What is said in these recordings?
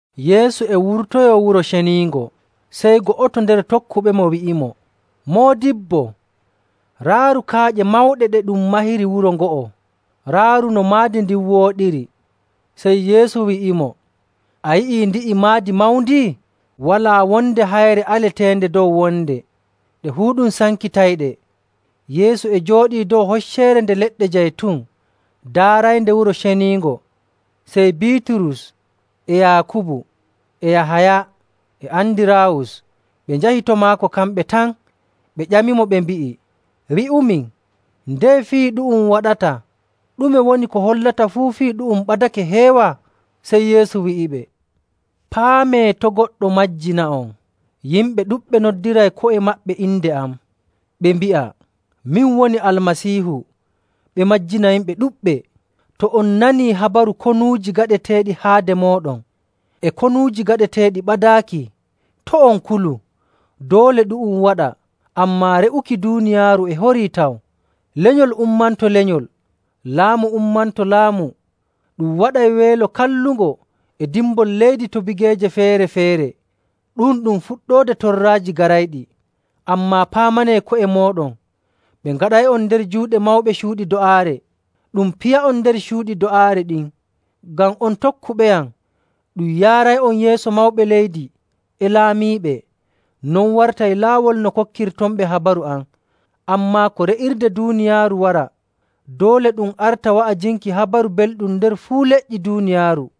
Yeesu e wurtoyoo Wuro Ceniingo, sey go'oto nder tokkuɓemo wi'imo, “Moodibbo, raaru kaaƴe mawɗe ɗe ɗum mahiri wuro ngo'o! Raaru no maadi ndin wooɗiri.” Sey Yeesu wi'imo, “A yi'ii ndi'i maadi mawndi? Walaa wonde hayre aleteende dow wonde. Ɗe fuu ɗum sankitayɗe.” Yeesu e jooɗii dow Hocceere Nde Leɗɗe Jaytun daaraynde Wuro Ceniingo, sey Biiturus, e Yaakubu, e Yahaya, e Andiraawus ɓe njahi to maako kamɓe tan, ɓe ƴamimo ɓe mbi'i, “Wi'umin, ndeye fii ɗu'um waɗata? Ɗume woni ko hollata fuu fii ɗu'um ɓadake heewa?” Sey Yeesu wi'iɓe, “Paamee to' goɗɗo majjina'on. Yimɓe ɗuɗɓe noddiray ko'e maɓɓe inde am, ɓe mbi'a ‘Min woni Almasiihu,’ ɓe majjina yimɓe ɗuɗɓe. To on nanii habaru konuuji gaɗeteeɗi haade mooɗon, e konuuji gaɗeteeɗi ɓadaaki, to' on kulu. Doole ɗu'um waɗa, ammaa re'uki duuniyaaru e horii taw. Lenyol ummanto lenyol, laamu ummanto laamu. Ɗum waɗay weelo kallungo e dimbol leydi to bigeeje feere‑feere. Ɗu'um ɗum fuɗɗoode torraaji garayɗi. “Ammaa paamanee ko'e mooɗon. Ɓe ngaɗay'on nder juuɗe mawɓe cuuɗi do'aare, ɗum piya'on nder cuuɗi do'aare ɗin. Ngam on tokkuɓeyam ɗum yaaray'on yeeso mawɓe leydi e laamiiɓe, non wartay laawol no kokkirtonɓe habaru am. Ammaa ko re'irde duuniyaaru wara, doole ɗum arta wa'ajinki Habaru Belɗum nder fuu leƴƴi duuniyaaru.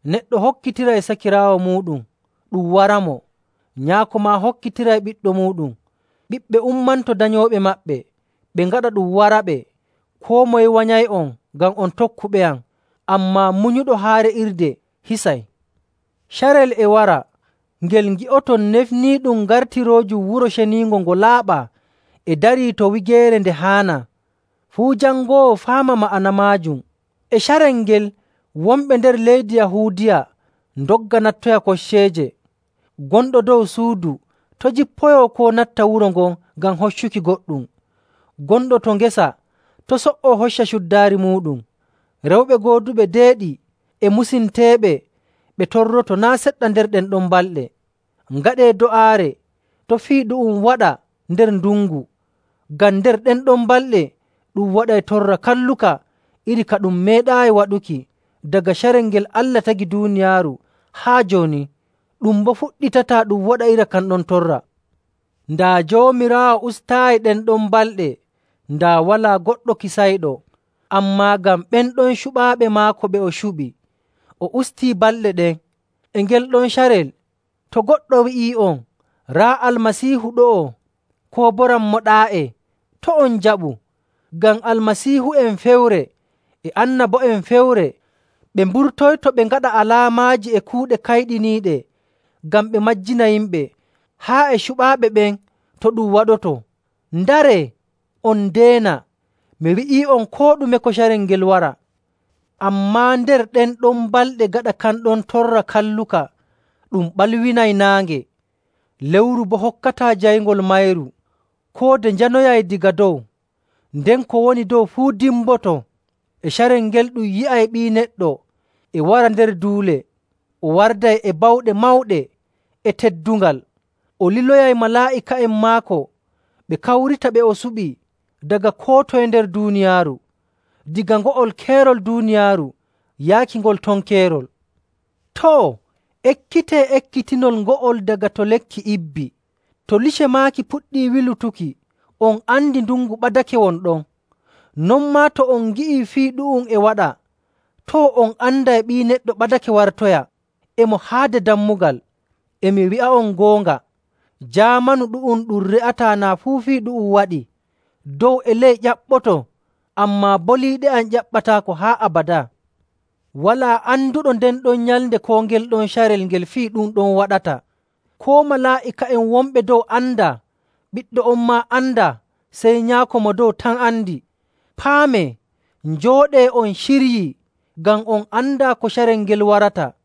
Neɗɗo hokkitiray sakiraawo muuɗum ɗum waramo, nyaako maa hokkitiray ɓiɗɗo muuɗum. Ɓiɓɓe ummanto danyooɓe maɓɓe, ɓe ngaɗa ɗum waraɓe. Koo moye wanyay'on ngam on tokkuɓeyam. Ammaa munyuɗo haa re'irde hisay.. “Carel e wara ngel ngi'oton ‘Nefniiɗum’ gartiroojum Wuro Ceniingo ngo laaɓaa e darii to wigeere nde haanaa. Fuu jangoowo faama ma'ana maajum. E carel ngel wonɓe nder leydi Yahuudiya ndogga nattoya kocceeje.. Gonɗo dow suudu to' jippoyoo koo natta wuro ngam hoccuki goɗɗum. Gonɗo to ngesa to' so''o hocca cuddaari muuɗum.. Rewɓe gooduɓe deeɗi e musinteeɓe ɓe torroto naa' seɗɗa nder ɗen ɗon balɗe! Ngaɗee do'aare to' fii ɗu'um waɗa nder ndungu. Ngam nder ɗen ɗon balɗe ɗum waɗay torra kalluka iri ka ɗum meeɗaayi waɗuki daga carel ngel Allah tagi duuniyaaru haa jooni. Ɗum boo fuɗɗitataa ɗum waɗa iri kan ɗon torra.. Daa Joomiraawo ustaayi ɗen ɗon balɗe, daa walaa goɗɗo kisayɗo. Ammaa ngam ɓen ɗon cuɓaaɓe maako ɓe o suɓi, o ustii balɗe ɗen. “E ngel ɗon carel to goɗɗo wi'ii'on, ‘Raa Almasiihu ɗo'o!’ koo boo, ‘Rammo ɗaa'e!’ to' on njaɓu. Ngam Almasiihu'en fewre e annabo'en fewre ɓe mburtoyto ɓe ngaɗa alaamaaji e kuuɗe kayɗiniiɗe ngam ɓe majjina yimɓe, haa e cuɓaaɓe ɓen to ɗum waɗoto. Ndaree, on ndeena! Mi wi'ii'on koo ɗume ko carel ngel wara. “Ammaa nder ɗen ɗon balɗe gaɗa kan ɗon torra kalluka, ɗum ɓalwinay naange, lewru boo hokkataa jayngol mayru.. Koode njanoyay daga dow, nden ko woni dow fuu dimboto.. E carel ngel ɗum yi'ay Ɓii Neɗɗo e wara nder duule. O warday e bawɗe mawɗe e teddungal.. O liloyay malaa'ika'en maako ɓe kawrita ɓe o suɓi daga koo toye nder duuniyaaru, daga ngo'ol keerol duuniyaaru yaaki ngol ton keerol. “Too, ekkitee ekkitinol ngo'ol daga to lekki ibbi. To lice maaki puɗɗii wilutuki, on andi ndungu ɓadake won ɗon. Non maa to on ngi'ii fii ɗu'um e waɗa, too, on anday Ɓii Neɗɗo ɓadake wartoya, e mo haade dammugal. E mi wi'a'on goonga, jaamanu ɗu'um ɗum re'ataa naa fuu fii ɗu'um waɗii. Dow e ley ƴaɓɓoto, ammaa boliiɗe am ƴaɓɓataako haa abadaa. “Walaa anduɗo nden ɗon nyalnde koo ngel ɗon carel ngel fii ɗum ɗon waɗata. Koo malaa'ika'en wonɓe dow andaa, Ɓiɗɗo on maa andaa, sey Nyaako Mo Dow tan andi.. Paamee, njooɗee on ciryii, ngam on andaa ko carel ngel warata.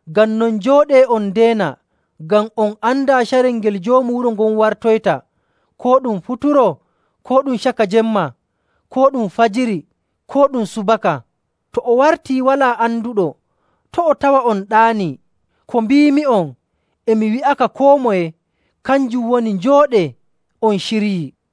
Ngam non, njooɗee on ndeena ngam on andaa carel ngel joomu wuro ngon wartoyta, koo ɗum futuro, koo ɗum caka jemma, koo ɗum fajiri, koo ɗum subaka. To o wartii walaa anduɗo, to' o tawa on ɗaanii. Ko mbiimi'on, e mi wi'aka koo moye, kanjum woni njooɗee on ciryii!”